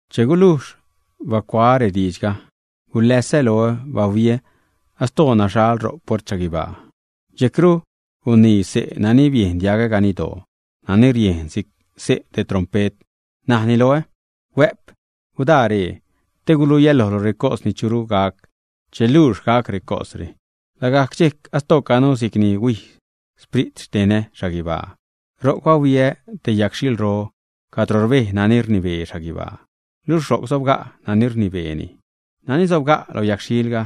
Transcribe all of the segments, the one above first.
Che gulujx bacuaä rediidxga, guläsä loä, bahuiä astoo naxhal ro puert xhaguibaa. Dxejcru gunii xse' nani biejn diagä ganiddoo, nani riejn si'c xse' te trompet, najni loä: ―Huä'p, gudaa ree, te guluiä lojlu recos ni churu gac che luux gac recosre. Lagajc dxejc astoocanu si'cni huij sprit xtenä xhaguibaa. Ro'c bahuiä te yagxhilro cadro rbej nani rnibee xhaguibaa, luxh ro'c sobga' nani rnibeeni. Nani sobga' lo yagxhilga,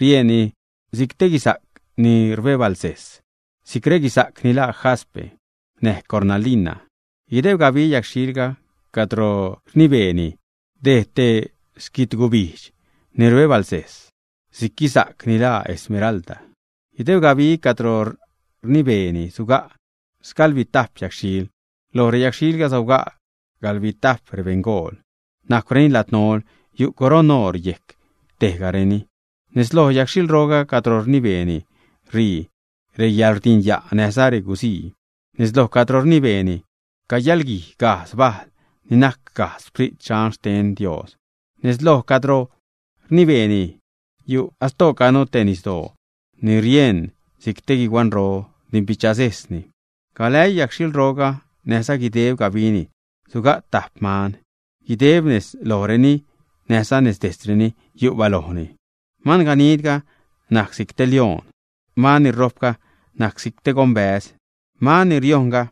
rieṉni si'c te guisa'c ni rbebalsejs, si'c reguisa'c ni laa jaspe, näj cornalina. Guideb gabi yagxhil cadro rnibeeni dejd te xquitgubijdx ni rbebalsejs si'c guisa'c ni laa esmeralda. Guideb gabi cadro rnibeeni suga' sgaḻbitajp yagxhil, loj reyagxhilga sobga' gaḻbitajp rebeṉgool, najcwreni ladnol, yu' coroṉ oor yejc tejgareni. Nez lo yagxhilro cadro rnibeeni ṟii reyäḻrdinya' näjza guzii. Nez loj cadro rnibeeni cayaḻguij gajdz bajl ni najc gajdz Sprit Dxan xten Dios. Nez loj cadro rnibeeni yu' astoocanu te nisdoo ni rieṉ si'c te guihuanro, rdimbichasejsni. Galäii yagxhilroga näjza guideb gabini suga' tajp man, guideb nez lojreni näjza nez dejtzreni yu' balojni. Manganidga najc si'c te lioṉ; man ni rojpga najc si'c te gonbäz; man ni riojṉga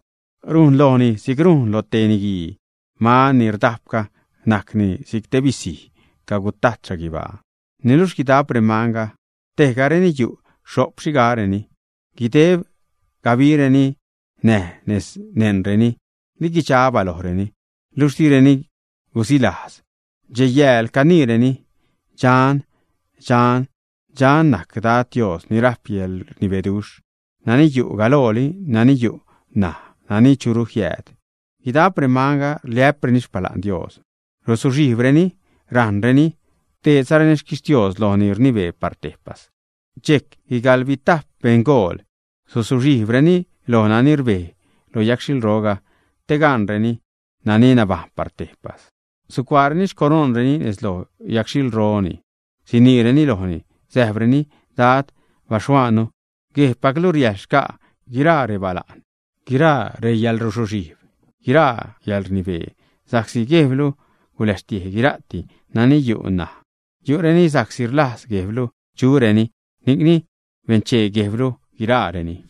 rujn lojni si'c rujn loj te niguii; man ni rdajpga najcni si'c te bisiro cagutajt xhaguibaa. Niluxh guidap remanga tejgareni yu' xho'p xhigareni, guideb gabireni, näj nez neṉreni liguidxa balojreni, niluxh direni gusilajz, dxej-yääl caniireni: Dxan, dxan, dxan najc Dad Dios ni rajp yäḻrnibeduxh, nani yu' galooli, nani yu' ṉaj, nani churu jiääd. Guidap remanga rliä'preni xpala'n Dios, rusuxhijbreni rajṉrenini, rdeedzareni xquixtios loj nani rnibee par tejpas. Dxejc guigaḻbitap rebeṉgool, suzuxhijbzareni loj nani rbej lo yagxhilro, te gaṉreni nani nabajṉ par tejpas. Sucuaareni xcoroṉreni nez loj xyagxhilroni, siniireni lojni, säjpreni: Dad Dios baxhuaannu, Guejbpaclu riäjḻ xca' guiraa rebala'n, guiraa reyäḻruzuxhijb, guiraa reyäḻrnibee, sa'csi Guejblu guläxtiej guira'ti nani yu' ṉaj, yu'reni sa'csi rlajz Guejblu chureni, ni'cni benchee Guejblu guiraareni.